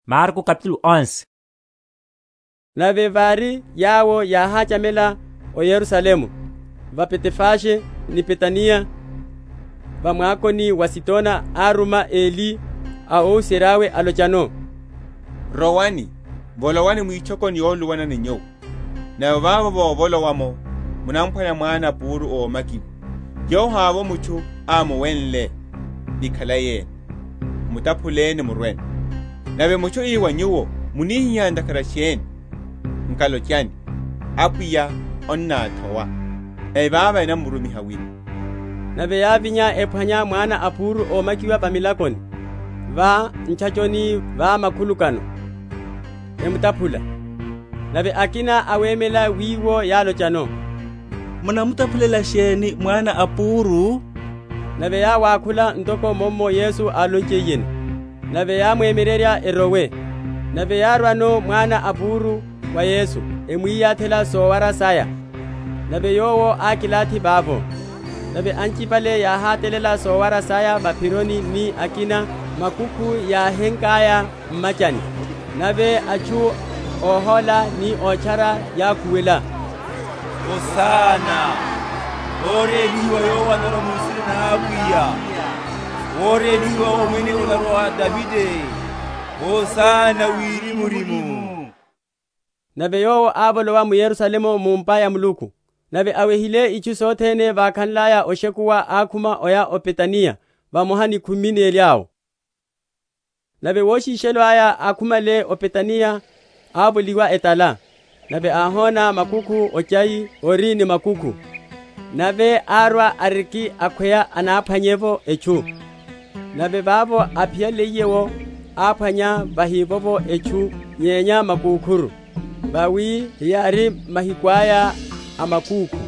Omwipela Yesu Hosana. Nave vári yawo yáháchamela o Yerusalemu, va Betefage ni Betaniya, va mwakoni wa Azitona, áruma eli a óhuserya’we, alochano, Rowani, volowani mwitchokoni yoluluwana ni nyuwo; nave vavo vovolowa’mo, munaphwanya mwana a púru ómakiwa, yowo havovo mutchu ámuwenle, ni khalai ene; mutaphuleni, murweno. Nave mutchu ii wa nyuwo, Munihihá ntakhara sheni? Nkalochani, Apwiya annáthowa; nave vavo enamurumiha wino. Nave yávinya, ephwanya mwana a púru ómakiwa va milakoni, va ntchachoni va makhulukano, emutaphula. Nave akina awemela wiwo yálochano, Munamutaphulela sheni mwana a púru? Nave yáwákhula ntoko mummo Yesu álonchiyeno; nave yáwemyererya erowe. Nave yárwano mwana a púru wa Yesu, emwiyatherya sowara saya, nave Yowo ákilathi vavo. Nave anchipale yáhatalela sowara saya va’phironi ni akina makukhu yáhenkaya m’machani. Nave atchu óhóla ni ótchara yákhuwela, Hosana; Órélihiwa Yowo anorwa mu nsina na Apwiya; Worélihiwa Omwene onamurwa, wa atithihu Davide; Hosana wirimurimu. Nave Yowo ávolowa m’Yerusalemu mu’mpa ya Muluku; nave awehile itchu sothene, vákhanlaya oshekuwa, ákhuma oya o Betaniya vamoha ni khumi neli awo. Wulumela mukúkhu. Nave woshishelo aya, akhumale o Betaniya, ávoliwa etala. Nave áhóna mukúkhu ochai ori ni makukhu; nave árwa ariki akhweya anáphwanye’vo etchu; nave vavo áphiyaliye’wo áphwanya vahivovo etchu nyenya makukhuru; vawi heyári mahiku aya a makúkhu.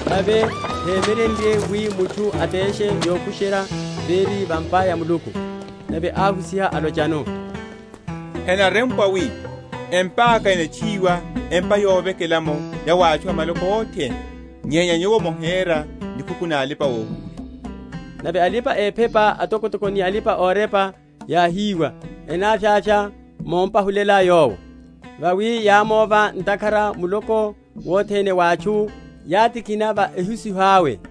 nave hémyerenrye wi mutchu ateshe yokusherya véri va’mpa ya Muluku. Nave áhusiha alochano, Henarempwa wi, Empa’ka enatchuwiwa empa yovekela’mo ya wa atchu a maloko othene; nyenya nyuwo mohera nikhuku na alipa‐ohuhula. Nave alipa‐ephepa atokotoko ni alipa‐orepa yáhiwa, enavyavya mompahulela Yowo; vawi yámóva, ntakhara muloko wothene wa atchu wátikhina va ehusiho awe.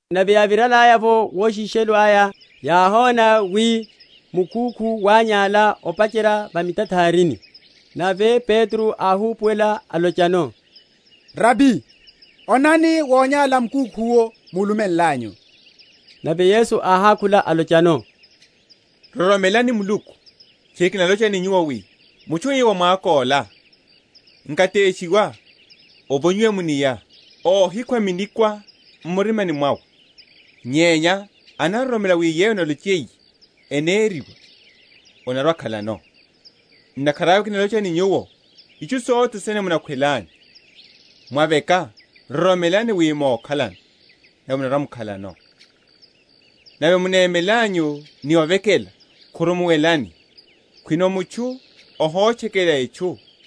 Nave yáviralaya’vo woshishelo aya, yáhona wi mukúkhu wányála opacherya va mitatharini. Nave Petro áhupuwela alochano, Rabi, onani, wonyála mukúkhu’wo múlumenlanyu. Nave Yesu áhákhula, alochano, Roromelani Muluku. Tchiri kinalocha ni nyuwo wi, Mutchu ii wa mwako’la, Nkateshiwa, ovonyiwe mu’nia, óhikhwa minikwa m’murimani mwawe, nyenya anaroromela wi yeyo analochiye, eneriwa, anarwa‐akhalano. Ntakhara awe kinalocha ni nyuwo, Itchu sothene munakhwelanyu, mwaveka, roromelani wi mokhalano nave munarwa‐mukhalano. Nave munemelanyu ni ovekela, khurumuwelani, khwino mutchu ohotchekela etchu;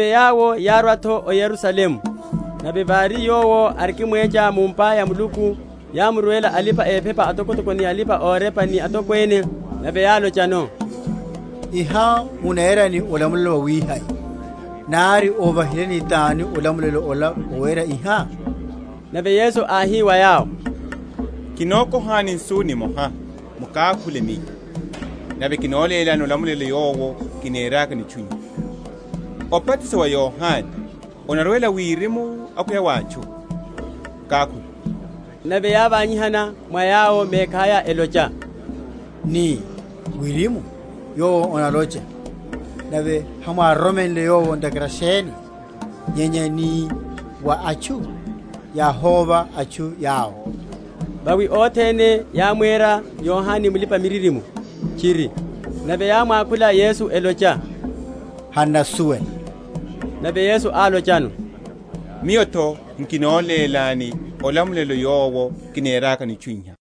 Nave yawo yárwa’tho o Yerusalemu; nave vári Yowo arikimwecha mu’mpa ya Muluku, yámurwela alipa‐ephepa atokotoko ni alipa‐orepa ni atokwene; nave yálochano, Iha munera ni olamulelo wawihai? Nari óvahileni tani olamulelo ola wawera iha? Nave Yesu áhi wa yawo, Kinokohani nsu nimoha, mukákhule Miyo, nave kinolélani olamulelo yowo kinerakano itchu iha. Obatiso wa Yohane onarwela wirimu akhweya wa atchu? Mukákhule. Nave yávanyihana mwa yawo mekhaya, elocha, Nii, Wirimu, Yowo analocha, Nave hamwároromenle yowo ntakhara sheni? Nyenya nii, Wa atchu, yáhóva atchu yawo; vawi othene yámwera Yohane mulipa‐miririmo tchiri. Nave yámwakhula Yesu, elocha, Han’nasuwela. Nave Yesu álochano, Miyo’tho nkolélani olamulelo yowo kinerakano itchu iha.